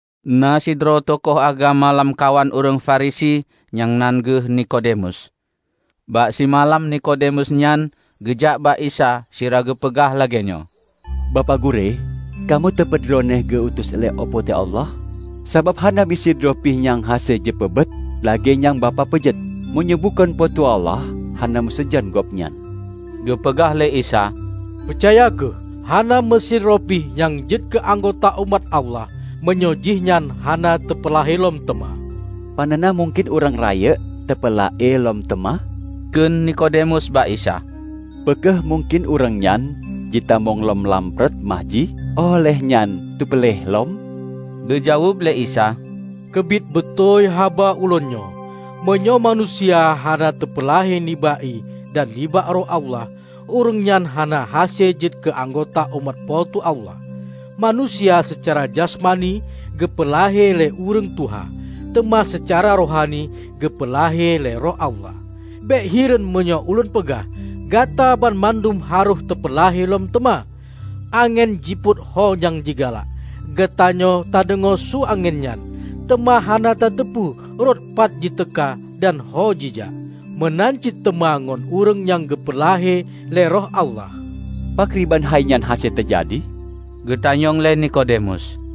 Na sidroe tukoh agama lamkawan ureuëng Farisi nyang nan geuh Nikodemus. Bak simalam Nikodemus nyan geujak bak Isa sira geupeugah lagéenyoe, "Bapak Gurée, kamoe teupeu Droeneueh geu utus lé Po teu Allah. Sabab hana meusidroe pih nyang hase jipeubuet buet lagée nyang Bapak peugét, meunyoe bukon Po teu Allah hana meusajan gobnyan." Geupeugah lé Isa, "Peucaya kheueh, hana meusidroe pih nyang jeuet keu anggota umat Allah, meunyoe jihnyan hana teupeulahé lom teuma." "Panena mungken ureuëng rayeuk teupeulahé lom teuma," kheun Nikodemus bak Isa, "Peu kheueh mungken ureuëng nyan jitamong lom lam pruet ma jih óh lheueh nyan teupeulahé lom?" Geujaweueb lé Isa, "Keubiet beutôi haba ulôn nyoe: Meunyoe manusia hana teupeulahé nibak ié dan nibak Roh Allah, ureuëng nyan hana hase jeuet keu anggota umat Po teu Allah. Manusia seucara jasmani geupeu lahé lé ureuëng tuha, teuma seucara rohani geupeu lahé lé Roh Allah. Bék hireuen meunyoe ulôn peugah: Gata banmandum harôh teupeulahé lom teuma. Angén jipot ho nyang jigalak; geutanyoe tadeungoe su angén nyan, teuma hana tateupeue rot pat jiteuka dan ho jijak. Meunan cit teuma ngon ureuëng nyang geupeu lahé lé Roh Allah." "Pakriban hainyan hase teujadi?" geutanyong lé Nikodemus.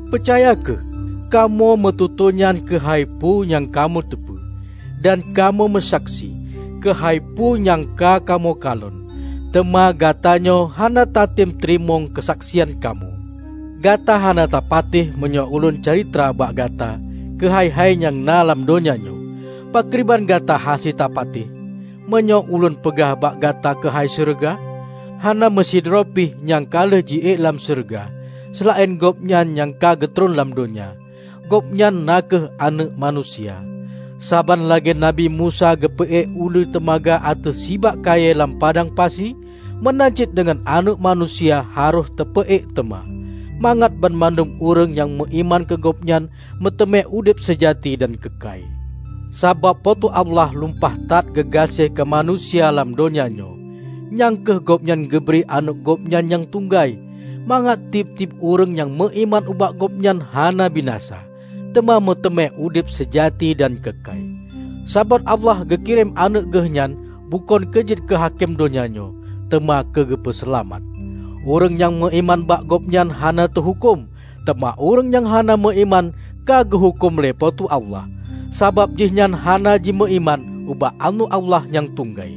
Peucaya kheueh: Kamoe meututoenyoe keuhai peue nyang kamoe teupeue, dan kamoe meusaksi keuhai peue nyang ka kamoe kalon; teuma gatanyoe hana tatem teurimong keusaksian kamoe. Gata hana tapatéh meunyoe ulôn calitra bak gata keuhai-hai nyang na lam donya nyoe; pakriban gata hase tapatéh, meunyoe ulôn peugah bak gata keuhai syeuruga? Hana meusidroe pih nyang ka lheueh jiék lam syeuruga, seulaén Gobnyan nyang ka geutron lam donya, Gobnyan na kheueh Aneuëk Manusia. Saban lagée Nabi Musa geupeuék uleue teumaga ateueh sibak kayée lam padang pasi, meunan cit deungon Aneuëk Manusia harôh teupeuék teuma, mangat banmandum ureuëng nyang meuiman keu Gobnyan meuteumé udeb seujati dan keukai." Sabab Po teu Allah lumpah that geugaséh keu manusia lam donya nyoe, nyang kheueh Gobnyan geubri Aneuëk Gobnyan nyang tunggai, mangat tieb-tieb ureuëng nyang meuiman ubak Gobnyan hana binasa, teuma meuteumé udeb seujati dan keukai. Sabab Allah geu kirém Aneuëk Geuhnyan bukon keu jeuet keu hakém donya nyoe, teuma keu geupeu seulamat. Ureuëng nyang meuiman bak Gobnyan hana teuhuköm. Teuma ureuëng nyang hana meuiman ka geuhuköm lé Po teu Allah, sabab jihnyan hana jimeuiman ubak Aneuëk Allah nyang tunggai.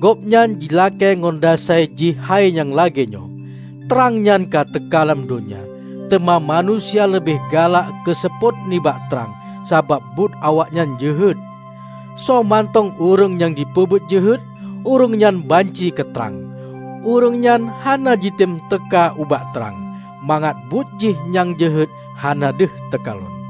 Gobnyan jilakée ngon dasai jih hai nyang lagée nyoe: Trang nyan ka teuka lam donya, teuma manusia leubeh galak keu seupôt nibak trang, sabab buet awaknyan jeuhet. Soemantong ureuëng nyang jipeubuet jeuhet, ureuëng nyan banci keu trang; ureuëng nyan hana jitem teuka ubak trang, mangat buet jih nyang jeuhet hana deuh teukalon.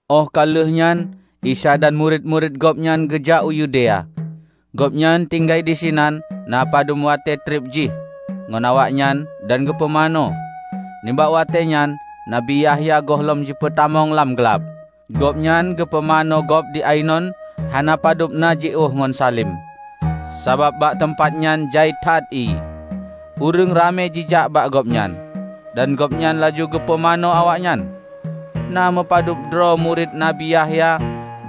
Óh ka lheuehnyan Isa dan murit-murit Gobnyan geujak u Yudea. Gobnyan tinggai disinan na padub watée treb jih ngon awaknyan dan geupumanö. Nibak watée nyan Nabi Yahya gohlom jipeutamong lam glab. Gobnyan geupumanö gob di Ainon, hana padub na jiôh ngon Salim, sabab bak teumpat nyan jai that ié. Ureuëng ramé jijak bak gobnyan, dan gobnyan laju geupumanö awaknyan. Na meupadubdroe murit Nabi Yahya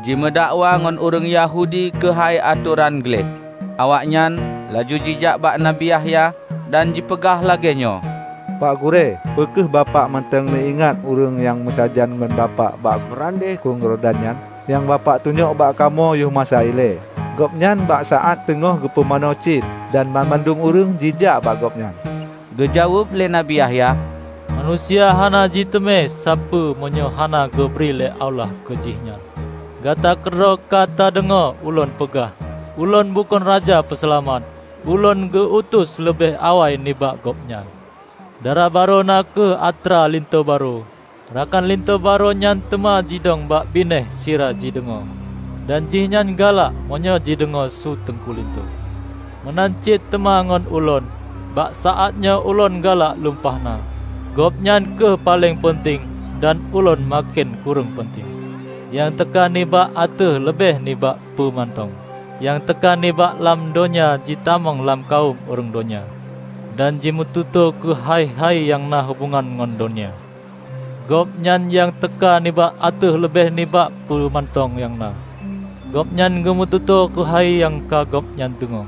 jimeudakwa ngon ureuëng Yahudi keuhai atoran gleh. Awaknyan laju jijak bak Nabi Yahya, dan jipeugah lagée nyoe, "Pak Gurée, peu kheueh Bapak mantong neuingat ureuëng nyang meusajan ngon Bapak di meurandeh Krueng Yordan nyan, nyang Bapak tunyok bak kamoe yoh masa ilée? Gobnyan bak saát teungoh geupumanö cit, dan banmandum ureuëng jijak bak Gobnyan!" Geujaweueb lé Nabi Yahya, "Manusia hana jiteumé sapeue meunyoe hana geubri lé Allah keu jihnyan. Gata keudroe ka tadeungoe ulôn peugah, 'Ulôn bukon Raja Peuseulamat. Ulôn geu-utus leubeh awai nibak Gobnyan.' Dara barô na kheueh atra linto barô. Rakan linto barô nyan teuma jidong bak binéh sira jideungoe, dan jihnyan galak meunyoe jideungoe su teungku linto. Meunan cit teuma ngon ulôn. Bak saátnyoe ulôn galak lumpah na. Gobnyan kheueh paleng peunteng, dan ulôn maken kureueng peunteng." Nyang teuka nibak ateueh leubeh nibak peue mantong. Nyang teuka nibak lam donya jitamong lam kawöm ureuëng donya, dan jimeututoe keuhai-hai nyang na hubongan ngon donya. Gobnyan nyang teuka nibak ateueh leubeh nibak peue mantong nyang na. Gobnyan geumeututoe keuhai nyang ka Gobnyan deungoe,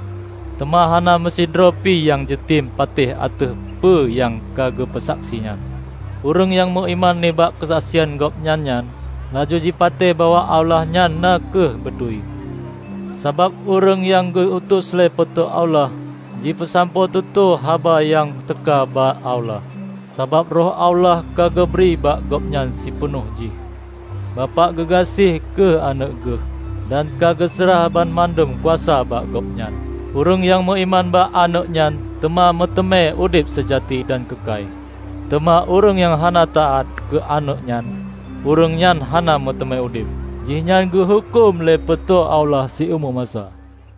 teuma hana meusidroe pih nyang jitem patéh ateueh peue nyang ka geupeu saksi nyan. Ureuëng nyang meuiman nibak keusaksian Gobnyan nyan, laju jipatéh bahwa Allah nyan na kheueh beutôi. Sabab ureuëng nyang geu-utus lé Po teu Allah jipeusampoe tutoe haba nyang teuka bak Allah, sabab Roh Allah ka geubri bak gobnyan sipeunoh jih. Bapak geugaséh keu Aneuëk Geuh, dan ka geuseurah banmandum kuasa bak Gobnyan. Ureuëng nyang meuiman bak Aneuëk nyan teuma meuteumé udeb seujati dan keukai. Teuma ureuëng nyang hana taát keu Aneuëk nyan ureuëng nyan hana meuteumé udeb. Jihnyan geuhuköm lé Po teu Allah siumu masa.